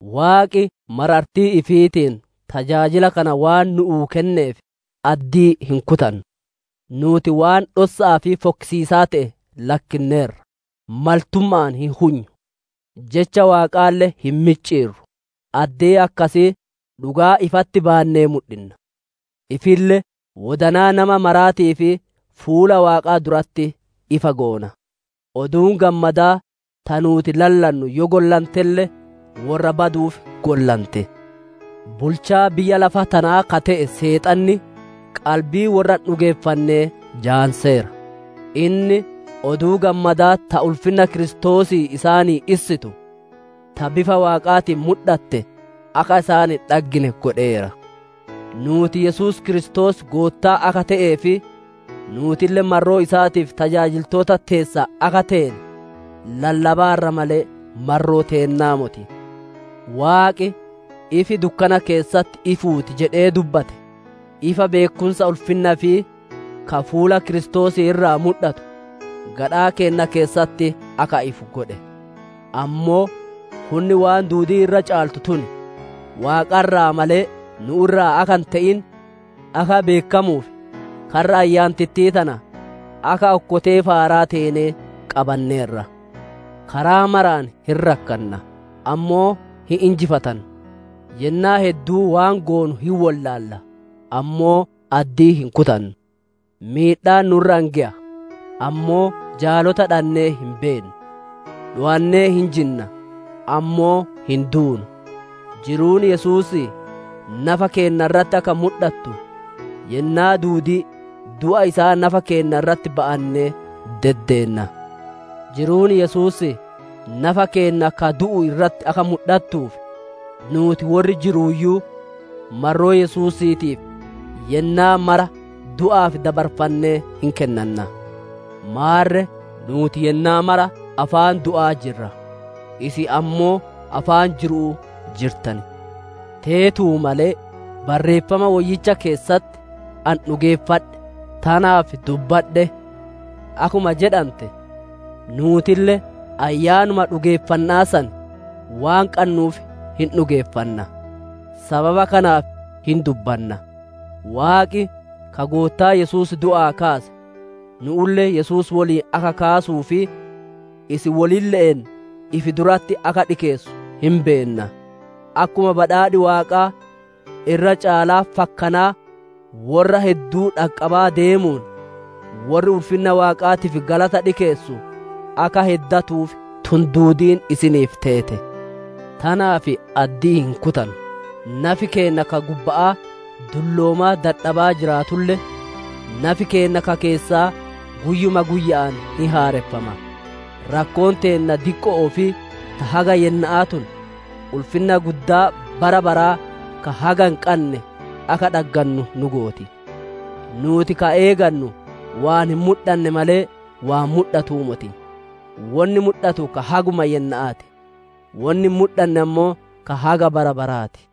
Waaqi marartii ifiitiin tajaajila kana waan nu'uu kenneef addii hin kutannu. Nuuti waan dhossa'aa fi fokkisiisaa te'e lakkinneerra; maltumma'aan hin hunyu; Jecha Waaqaalle hin micciirru; addee akkasii dhugaa ifatti baannee mudhinna; ifille wodanaa nama maraatiif fuula Waaqaa duratti ifa goona. Oduun Gammadaa ta nuuti lallannu yoo gollantelle, worra baduuf gollante. Bulchaa biyya lafa tanaa ka te'e Seexanni qalbii worra hin dhugeeffannee jaamseera; inni Oduu Gammadaa ta ulfinna Kiristoosii isaanii issitu, ta bifa Waaqaatiin mudhatte akka isaan hin dhaggine godheera. Nuuti Yesuus Kiristoos Goottaa akka te'ee fi nuutille marroo isaatiif tajaajiltoota teessan akka teene lallabaarra malee, marroo teennaa moti. Waaqi, «Ifi dukkana keessatti ifuu ti» jedhee dubbate, ifa beekkumsa ulfinna ifii ka fuula Kiristoosii irraa mudhatu, gadhaa keenna keessatti akka ifu godhe. Ammoo hunni waan duudii irra caaltu tun, Waaqa irraa malee nu'u irraa akka hin te'in akka beekkamuuf karra ayyaantittii tana akka okkotee faaraa teenee qabanneerra. Karaa maraan hin rakkanna, ammoo hin injifatannu; yennaa hedduu waan goonu hin wollaalla, ammoo addii hin kutannu. Miidhaan nu'u irra hin geya, ammoo jaalota dhannee hin beennu; dhowannee hin jinna, ammoo hin duunu. Jiruun Yesuusii nafa keenna irratti akka mudhatu, yennaa duudii du'a isaa nafa keenna irratti ba'annee deddeenna. Jiruun Yesuusii nafa keenna ka du'u irratti akka mudhattuuf, nuuti worri jirruuyyuu marroo Yesuusiitiif yennaa mara du'aaf dabarfannee hin kennanna. Maarre nuuti yennaa maraa afaan du'aa jirra, isin ammoo afaan jiru'u jirtan. Teetuu malee Barreeffama Woyyicha keessatti, «Ani dhugeeffadhe; tanaaf dubbadhe» akkuma jedhante, nuutille ayyaanuma dhugeeffanna'aa san waan qannuuf hin dhugeeffanna. Sababa kanaaf hin dubbanna. Waaqi ka Goottaa Yesuus du'aa kaase, nu'ulle Yesuus woliin akka kaasuu fi isin wolille'een ifi duratti akka dhikeessu hin beenna. Akkuma badhaadhi Waaqaa irra caalaa fakkanaa worra hedduu dhaqqabaa deemuun, worri ulfinna Waaqaatiif galata dhikeessu akka heddatuuf tun duudiin isiniif teete. Tanaaf addii hin kutannu. Nafi keenna ka gubba'aa dulloomaa dadhabaa jiraatulle, nafi keenna ka keessaa guyyuma guyya'aan hin haareffama. Rakkoon teenna diqqo'oo fi ta haga yenna'aa tun, ulfinna guddaa bara baraa ka haga hin qanne akka dhaggannu nu gooti. Nuuti ka eegannu waan hin mudhanne malee, waan mudhatuu moti. Wonni mudhatu ka haguma yenna'aa ti; wonni hin mudhanne ammoo ka haga bara baraa ti.